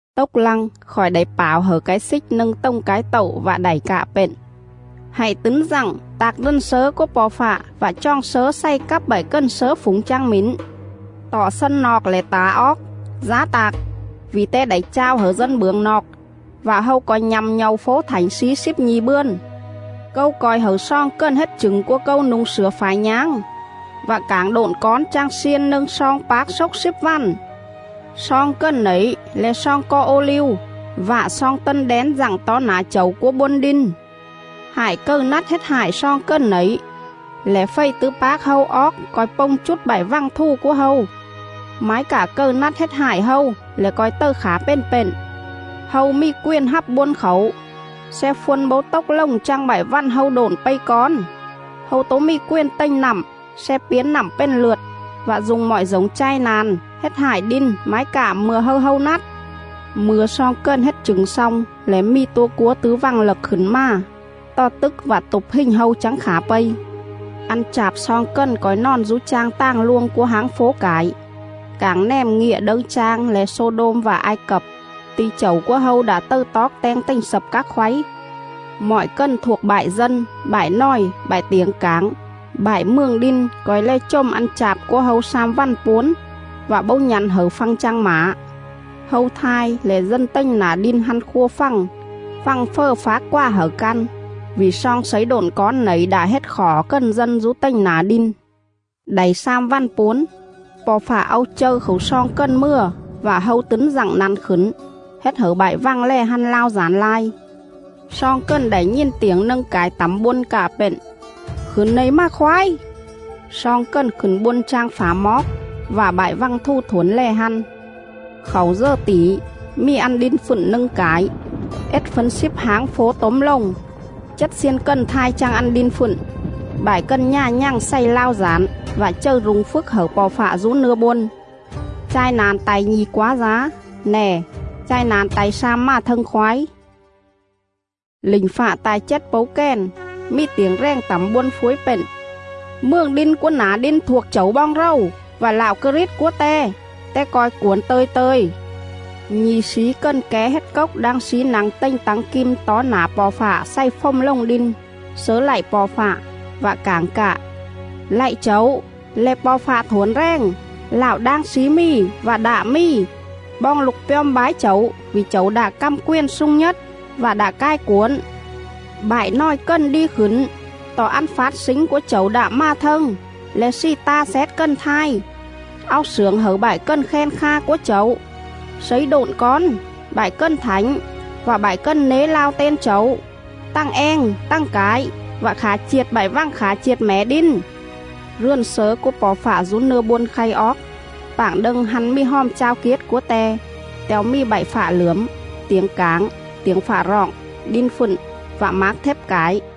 Tốc lăng khỏi đảy pảo hẩư cái xích nâng tồng cái tậu vạ đảy cạ pện: “Hạy tứn dặng tạc rườn slớ cúa Po̱ Fạ vạ choòng slớ xày cắp bại cần slớ phủng chang mỉn.. Tọ xân noọc lẻ tả oóc, dá tac; vỉ te đảy chao hẩư dân bưởng noọc, vạ hâu co̱i nhă̱m nhâu fố thảnh slí slíp nhi̱ bươn.. Câu co̱i hẩư sloong cần hết chửng cúa Câu nu̱ng slửa phải nháng vạ cảng độn cón chang xiên nâng sloong pác xốc slíp vằn.” Sloong cần nẩy le̱ sloong co ô-liu vạ sloong tân đén dặng tó nả Chẩu cúa bôn đin.. Hại cầư nắt hết hại sloong cần nẩy lẻ fầy tứ pác hâu oóc co̱i pông chút bại vằng thù cúa hâu; mái cạ cầư nắt hết hại hâu lẻ co̱i tầư khả pền pện. Hâu mì quền hắp bôn khảu sle phân bấu tốc lồng chang bại vằn hâu độn pây cón; hâu tố mì quền tềnh nặm sle piến nặm pền lượt, vạ du̱ng mọi dổng chai na̱n hết hại đin mái cạ mư̱a hâư hâu nắt.. Mư̱a sloong cần hết chửng xong lẻ mì tua cúa tứ vằng lậc khửn mà, tò tức vạ tụp hình hâu chắng khả pây.. Ăn chạp sloong cần co̱i nòn dú chang tàng luông cúa háng fố cải, cảng nèm ngịa đâư chang le̱ Xô-đôm vạ Ai Cập, ti̱ Chẩu cúa hâu đạ tầư toóc teng tềnh slập các khoáy.. Mọi cần thuộc bại dân, bại nòi, bại tiểng cảng, bại mường đin co̱i lè chồm ăn chạp cúa hâu slam vằn puốn, vạ bấu nhă̱n hẩư phăng chang mả. Hâu thai lẻ dân tềnh nả đin hăn khua fằng, fằng fờ phác quà hẩư căn, vỉ sloong slấy độn cón nẩy đạ hết khỏ cần dân dú tềnh nả đin. Đảy slam vằn puốn, Po̱ Fạ au châư khảu sloong cần mừa vạ hâu tứn dặng năn khửn, hết hẩư bại vằng lè hăn lao dản lai.. Sloong cần đảy nhìn tiểng nâng cải tẳm bôn cạ pện: “Khửn nẩy mà khoái!” Sloong cần khửn bôn chang phả moóc; vạ bại vằng thù thuổn lè hăn.. Khảu dờ tỉ, mì ăn đin fựn nâng cải; ết fấn slíp háng fố tốm lồng; chết xiên cần thai chang ăn đin fựn. Bại cần nhà nhằng xày lao dản vạ chầư rung phjức hẩư Po̱ Fạ dú nưa bôn.. Chai na̱n ta̱i nhi̱ quá dá; nè, chai na̱n ta̱i slam mà thâng khoái. Lỉnh fạ ta̱i chết pấu kèn, mì tiểng rèng tẳm bôn phuối pện: “Mường đin cúa nả đin thuộc Chẩu boong rầu, Vạ Lạo Krit cúa Te. Te co̱i cuổn tơ̱i tơ̱i.”. Nhi̱ slí cần ké hết cốc đang slí nă̱ng tềnh tắng kim tó nả Po̱ Fạ xày fồm lồng đin, slớ lạy Po̱ Fạ, vạ cảng cạ: “Lạy Chẩu, le̱ Po̱ Fạ Thuổn Rèng, LẠO ĐANG SLÍ MÌ VẠ ĐẠ MÌ, Boong lục pjom bái Chẩu vỉ Chẩu đạ căm quền slung nhết, Vạ đạ cai cuổn. Bại nòi cần đi khửn;. Tọ ăn fát slính cúa Chẩu đạ mà thâng, Le̱ slì ta xét cần thai, Au slưởng hẩư bại cần khen kha cúa Chẩu, slấy độn cón, bại cần thảnh, Vạ bại cần nế lao ten Chẩu, Tằng eng tằng cải, Vạ khả chiệt bại vằng khả chiệt mẻ đin.” Rườn slớ cúa Po̱ Fạ dú nưa bôn khay oóc, pạng đâng hăn mì Hòm Chao Kiết cúa Te, te̱o mì bại fạ lưởm, tiểng cảng, tiểng fạ roọng, đin fựn vạ mác thếp cải..